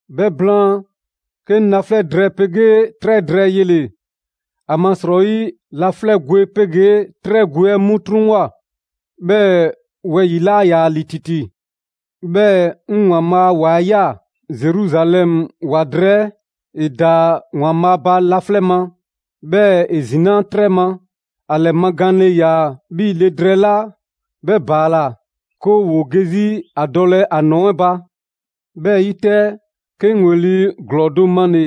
'Bhɛ blaan, 'ke 'ŋ laflɛ' drɛɛ 'pegee 'trɛ drɛɛ yele‑. ‑Amasrɔyi laflɛ' gwe 'pegee 'trɛ gwe 'ɛ 'mu 'truŋwoa꞊, 'bhɛɛ‑ wɛyi‑ 'laa ‑yaa ‑li ‑titi. 'Bhɛɛ‑ 'ŋ ‑Waanbhaa' a ‑wa 'ɛ ꞊ya, Zeruzalɛmu ‑wa drɛɛ 'ɛ. ‑E ‑daa ‑Waanbhaa' ba laflɛ' ma, 'bhɛɛ‑ ‑e ‑zinaa' 'trɛ ma. ‑A ‑lɛmagaanle le ‑yaa 'bhii‑ le drɛɛ 'la 'bhɛ ‑baala 'ke ‑woo ge 'zi ‑a dɔlɛ ‑a ‑nɔɔ 'ɛ ba. 'Bhɛ 'yi 'tɛ, 'ke 'ŋ ‑weli' ‑glɔɔ do male‑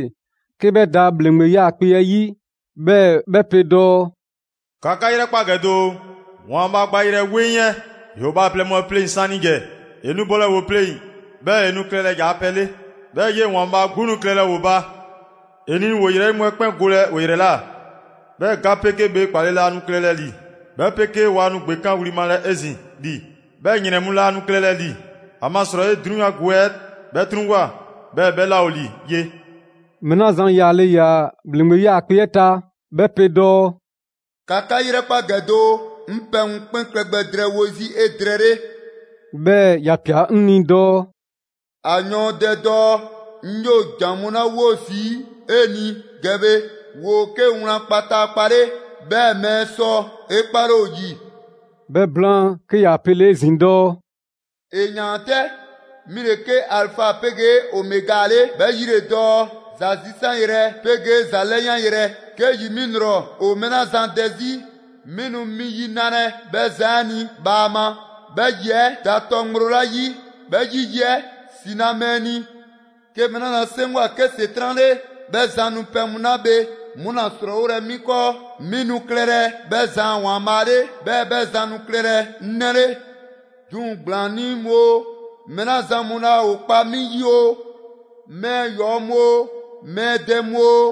'ke 'bhɛ da ‑bhleŋgbe 'yaakpe‑ 'ɛ 'yi, 'bhɛɛ‑ 'bhɛ pe dɔɔ: «‑Ka 'ka 'yrɛkpa ‑gɛ doo, ‑Waanbhaa' gbayrɛ 'weŋ 'ɛ ‑yoo bhaaplɛŋ mu pleŋ‑ 'saanigɛ! ‑E nu bolɛ ‑o pleŋ‑, 'bhɛɛ‑ ‑o nu klɛlɛ ‑yaa' pɛ 'le. 'Bhɛɛ‑ 'yee‑ ‑Waanbhaa' 'gbu nu klɛlɛ ‑o ba. ‑E nu ‑o ‑yrɛyi' mu 'ɛ 'kpɛn golɛ ‑o ‑yrɛ ꞊la. 'Bhɛɛ‑ ga 'pegee bhee 'kpale‑ laa nu klɛlɛ ‑li, 'bhɛ 'pegee waa nu ‑gbekanwli malɛ 'ezin‑ ‑li, 'bhɛɛ‑ ‑yrɛn mu laa nu klɛlɛ ‑li. ‑Amasrɔyi 'drunyan gwe 'ɛ 'bhɛ 'truŋwoa꞊, 'bhɛɛ‑ 'bhɛ 'laa ‑o ‑li ye.» Mɛɛ 'la zan yaale ‑yaa ‑bhleŋgbe 'yaakpe‑ 'ɛ ta 'bhɛ pe dɔɔ: «‑Ka 'ka 'yrɛkpa ‑gɛ doo, 'ŋ pɛ mu 'kpɛn klɛ gbɛ drɛɛwo 'zi 'edrɛɛle.» 'Bhɛɛ‑ ‑ya ꞊pia 'ŋ ni dɔɔ: «‑A yɔɔndɛ dɔɔ: ‹'Ŋ 'yoo ‑jan mu 'la 'wo zii' 'e ni ‑gɛ bhe ‑woo 'ke wlan kpataakpa 'le, 'bhɛɛ‑ mɛɛ sɔ 'e 'kpale ‑o ‑yi›.» 'Bhɛ blaan, 'ke ‑ya pele‑ 'ezin‑ dɔɔ: «‑E ‑yaan 'tɛ! 'Mi ‑le 'ke Alifa 'pegee Omega 'le, 'bhɛ 'yi ‑le dɔɔ: ‹‑Za zisanyrɛ 'pegee ‑za 'lɛyanyrɛ›. 'Ke ‑yi 'mi ‑lrɔ ‑o mɛɛ 'la zan dɛ 'zi, 'mi nu mi yi nalɛ 'bhɛ zan 'ɛ ni bhaama, 'bhɛ ‑yi 'ɛ da tɔ ŋgblo 'la 'yi 'bhɛ 'yi ‑yi 'ɛ ‑si na mɛɛ ni. 'Ke mɛɛ 'la zan 'seŋgwa‑ 'ke ‑Setran' 'le, 'bhɛ zan nu pɛ mu 'la bhe 'mu ‑la srɔɔwolɛ 'mi 'kɔɔ. 'Mi nu klɛlɛ 'bhɛ zan a ‑Waanbhaa' 'le, 'bhɛɛ‑ 'bhɛ zan nu klɛlɛ 'ŋ 'nɛ 'le. 'Duŋ‑ ‑gblaannii' mu oo, mɛɛ 'la zan mu laa ‑o kpa 'mi 'yi oo, mɛɛ ‑yɔɔ' mu oo, mɛɛ dɛ mu oo,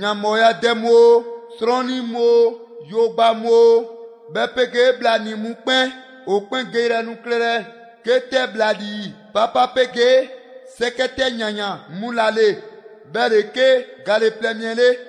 ‑yanbhɔɔya dɛ mu oo, 'srɔnnii mu oo, yogba mu oo 'bhɛ 'pegee bhlanii‑ mu 'kpɛn, ‑o 'kpɛn geyrɛ nu klɛlɛ 'ke 'tɛ ‑bhlalii 'papa 'pegee 'sɛkɛ 'tɛ ‑yansaan 'mu ‑la ‑le. 'Bhɛ ‑le 'ke gale plɛ mi 'ɛ 'le.»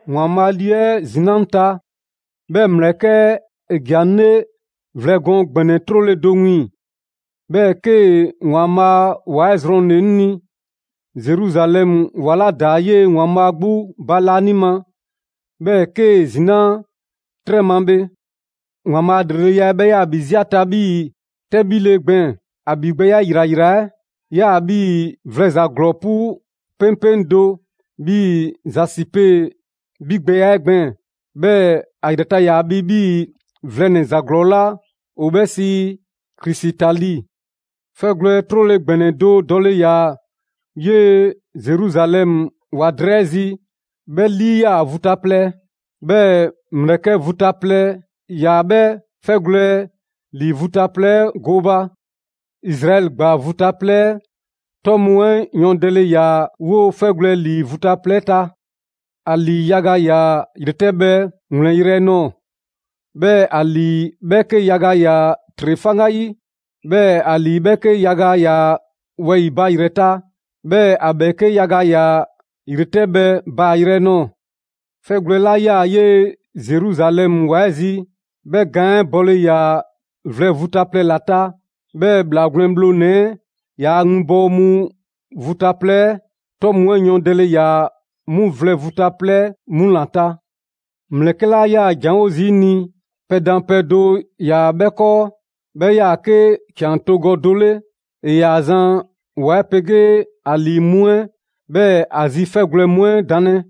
‑Waanbhaa' Lii 'ɛ ‑zinaa' 'ŋ ta, 'bhɛɛ‑ ‑mlɛkɛ' 'ɛ ‑ja 'ŋ 'le vlɛ gɔɔn ‑gbɛnɛ 'trole‑ do wiiŋ‑. 'Bhɛɛ‑ 'kee‑ ‑Waanbhaa' a ‑wa 'ɛ zrɔnle‑ 'ŋ ni, Zeruzalɛmu ‑wa 'la da 'yee‑ ‑Waanbhaa' 'gbu ba laanima, 'bhɛɛ‑ 'kee‑ zinaa' 'trɛ ma bhe. ‑Waanbhaa' a ‑lreleya 'ɛ 'bhɛ 'yaa‑ ‑bhi 'zi ‑a ta 'bhii‑ 'tɛbhile gbɛɛn‑. ‑A ‑bhigbɛya ‑yrayra 'ɛ 'yaa‑ 'bhii‑ vlɛnɛ‑ ‑za ‑glɔɔ 'pu 'peŋpeŋ do; 'bhii‑ zasipe 'bhigbɛya 'ɛ gbɛɛn‑. 'Bhɛɛ‑ ‑a ‑yrɛ ta ‑yaa bhi 'bhii‑ vlɛnɛ‑ ‑za ‑glɔɔ 'la ‑o 'bhɛ sii krisitali. 'Fɛgwlɛ‑ 'trole‑ ‑gbɛnɛ do dɔle ‑yaa 'yee‑ Zeruzalɛmu ‑wa drɛɛ 'ɛ zi, 'bhɛ 'lii 'yaa‑ vu ta plɛ, 'bhɛɛ‑ ‑mlɛkɛ' vu ta plɛ ‑yaa 'bhɛ 'fɛgwlɛ‑ ‑lii vu ta plɛ 'ɛ gooba. Izraɛli ‑gbaa vu ta plɛ 'ɛ 'tɔ mu 'ɛ yɔɔndɛle ‑yaa 'woo‑ 'fɛgwlɛ‑ ‑lii vu ta plɛ 'ɛ ta. ‑A ‑lii yaga ‑yaa ‑yretɛbhɛ ‑wlɛnyrɛ' nɔɔ‑, 'bhɛɛ‑ ‑a ‑lii 'bhɛɛke yaga ‑yaa ‑tre 'faŋgayi. 'Bhɛɛ‑ ‑a ‑lii 'bhɛɛke yaga ‑yaa wɛyi‑ ba ‑yrɛ ta; 'bhɛɛ‑ ‑a ‑bhɛɛke' yaga ‑yaa ‑yretɛbhɛ baayrɛ nɔɔ‑. 'Fɛgwlɛ‑ 'la 'yaa‑ 'yee‑ Zeruzalɛmu ‑wa 'ɛ zi, 'bhɛ gaan 'ɛ bɔle ‑yaa vlɛ vu ta plɛ ‑la ta; 'bhɛɛ‑ ‑Bhlaa Gwlɛn Bhlonɛ‑ 'ɛ ‑yaa' winbɔwo mu vu ta plɛ 'ɛ 'tɔ mu 'ɛ yɔɔndɛle ‑yaa 'mu vlɛ vu ta plɛ 'ɛ 'mu ‑la ta. ‑Mlɛkɛ' 'la 'yaa‑ ‑janwo' zii' 'ŋ ni, pɛdanpɛ do ‑yaa 'bhɛ 'kɔɔ, 'bhɛ 'yaa‑ 'ke ‑can togɔ do 'le. ‑E ‑yaa zan ‑wa 'ɛ 'pegee ‑a ‑lii mu 'ɛ, 'bhɛɛ‑ ‑a zi 'fɛgwlɛ‑ 'ɛ 'mu danlɛ.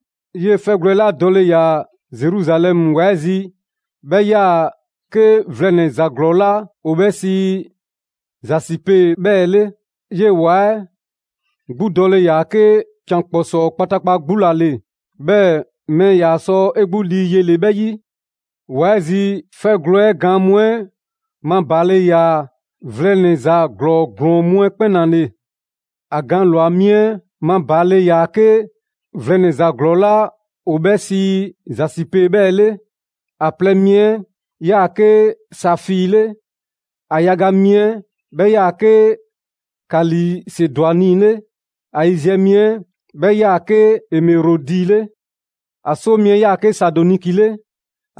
'Yee‑ 'fɛgwlɛ‑ 'la dɔle ‑yaa Zeruzalɛmu ‑wa 'ɛ zi 'bhɛ 'yaa‑ 'ke vlɛnɛ‑ ‑za ‑glɔɔ 'la ‑o 'bhɛ sii zasipe 'bhɛɛ‑ 'le. 'Yee‑ ‑wa 'ɛ 'gbu dɔle ‑yaa 'ke ‑can ‑kpɔsɔɔ kpataakpa 'gbu ‑la ‑le, 'bhɛɛ‑ mɛɛ ‑yaa sɔ 'e 'gbu lii yele 'bhɛ 'yi. ‑Wa 'ɛ zi 'fɛgwlɛ‑ 'ɛ gaan mu 'ɛ mabaale ‑yaa vlɛnɛ‑ ‑za ‑glɔɔ ‑glɔɔn mu 'ɛ 'kpɛn ‑la ‑le: ‑A gaan ꞊lwa mi 'ɛ mabaale ‑yaa 'ke vlɛnɛ‑ ‑za ‑glɔɔ 'la ‑o 'bhɛ zasipe 'bhɛɛ‑ 'le; ‑a plɛ mi 'ɛ 'yaa‑ 'ke safii 'le, ‑a yaga mi 'ɛ 'bhɛ 'yaa‑ 'ke kalisedwani 'le, ‑a yiziɛ mi 'ɛ 'bhɛ 'yaa‑ 'ke emerɔdi 'le; ‑a 'soo mi 'ɛ 'yaa‑ 'ke saadoniki 'le,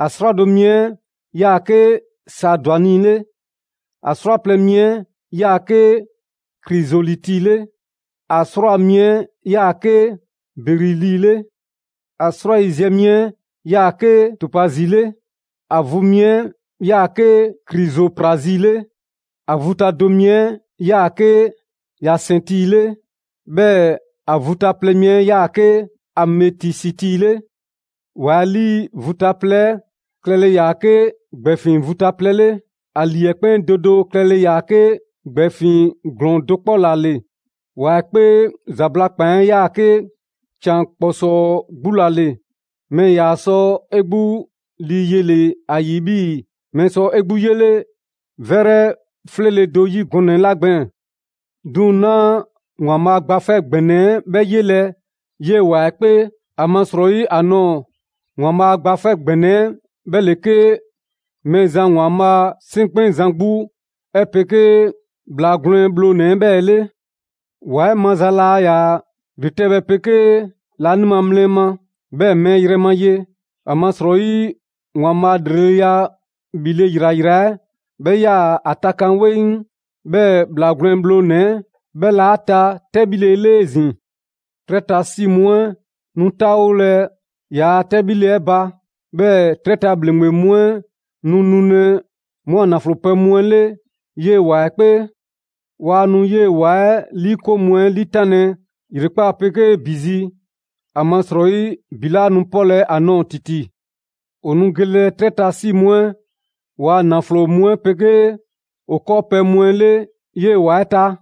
‑a 'srwado‑ mi 'ɛ 'yaa‑ 'ke saadwani 'le, ‑a 'srwaplɛ‑ mi 'ɛ 'yaa‑ 'ke krisoliti 'le, ‑a 'srwaa‑ mi 'ɛ 'yaa‑ 'ke berili 'le, ‑a 'srwayiziɛ mi 'ɛ 'yaa‑ 'ke topazi 'le, ‑a vu mi 'ɛ 'yaa‑ 'ke krizoprazi 'le, ‑a vu ta do mi 'ɛ 'yaa‑ 'ke yasɛnti 'le, 'bhɛɛ‑ ‑a vu ta plɛ mi 'ɛ 'yaa‑ 'ke ametisiti 'le. ‑Wa 'ɛ 'lii vu ta plɛ 'ɛ klɛle ‑yaa 'ke ‑gbɛɛfiŋ vu ta plɛ 'le; ‑a ‑lii 'ɛ 'kpɛn do do klɛle ‑yaa 'ke ‑gbɛɛfiŋ ‑glɔɔn do 'kpɔ ‑la ‑le. ‑Wa 'ɛ 'kpee ‑zabla' ‑kpan 'ɛ 'yaa‑ 'ke ‑can ‑kpɔsɔɔ 'gbu ‑la ‑le, mɛɛ ‑yaa sɔ 'e 'gbu lii yele ‑a ‑yi 'bhii‑ mɛɛ sɔ 'e ‑gbu 'yele 'vɛrɛ 'fleele‑ do 'yi gɔnɛ‑ 'la gbɛɛn‑. 'Duŋ‑ 'naa ‑Waanbhaa' Gba 'Fɛ ‑Gbɛnɛ 'ɛ 'bhɛ 'yelɛ‑ 'yee‑ ‑wa 'ɛ 'kpee, ‑amasrɔyi ‑a nɔɔ‑ ‑Waanbhaa' Gba 'Fɛ ‑Gbɛnɛ 'ɛ 'bhɛ ‑le 'ke Mɛɛzan ‑Waanbhaa' 'Seŋkpɛnzan 'gbu 'ɛ 'pegee ‑Bhlaa Gwlɛn Bhlonɛ‑ 'bhɛɛ‑ 'le. ‑Wa 'ɛ maza laa ‑yaa ‑yretɛbhɛ 'pegee laanima mlɛ ma, 'bhɛɛ‑ mɛɛ yrɛ ma ye, ‑amasrɔyi ‑Waanbhaa' ‑lreleya 'bhile‑ ‑yrayra 'ɛ 'bhɛ 'yaa‑ ‑a takan 'weŋ; 'bhɛɛ‑ ‑Bhlaa Gwlɛn Bhlonɛ‑ 'bhɛ ‑le 'a ta 'tɛbhile 'le 'ezin‑. 'Trɛ ta 'si mu 'ɛ nu 'taawolɛ ‑yaa' 'tɛbhile 'ɛ ba, 'bhɛɛ‑ 'trɛ ta ‑bhleŋgbe mu 'ɛ nu nulɛ 'mu a ‑naflo pɛ mu 'ɛ 'le 'yee‑ ‑wa 'ɛ 'kpee. Waa nu 'yee‑ ‑wa 'ɛ 'liikoŋ mu 'ɛ 'liitanlɛ ‑yrekpaa' 'pegee ‑bi zi, ‑amasrɔyi ‑bi 'laa nu 'pɔlɛ‑ ‑a nɔɔ‑ ‑titi. ‑O nu gelɛ 'trɛ ta 'si mu 'ɛ ‑waa' ‑naflo mu 'ɛ 'pegee ‑o 'kɔɔpɛ‑ mu 'ɛ 'le 'yee‑ ‑wa 'ɛ ta.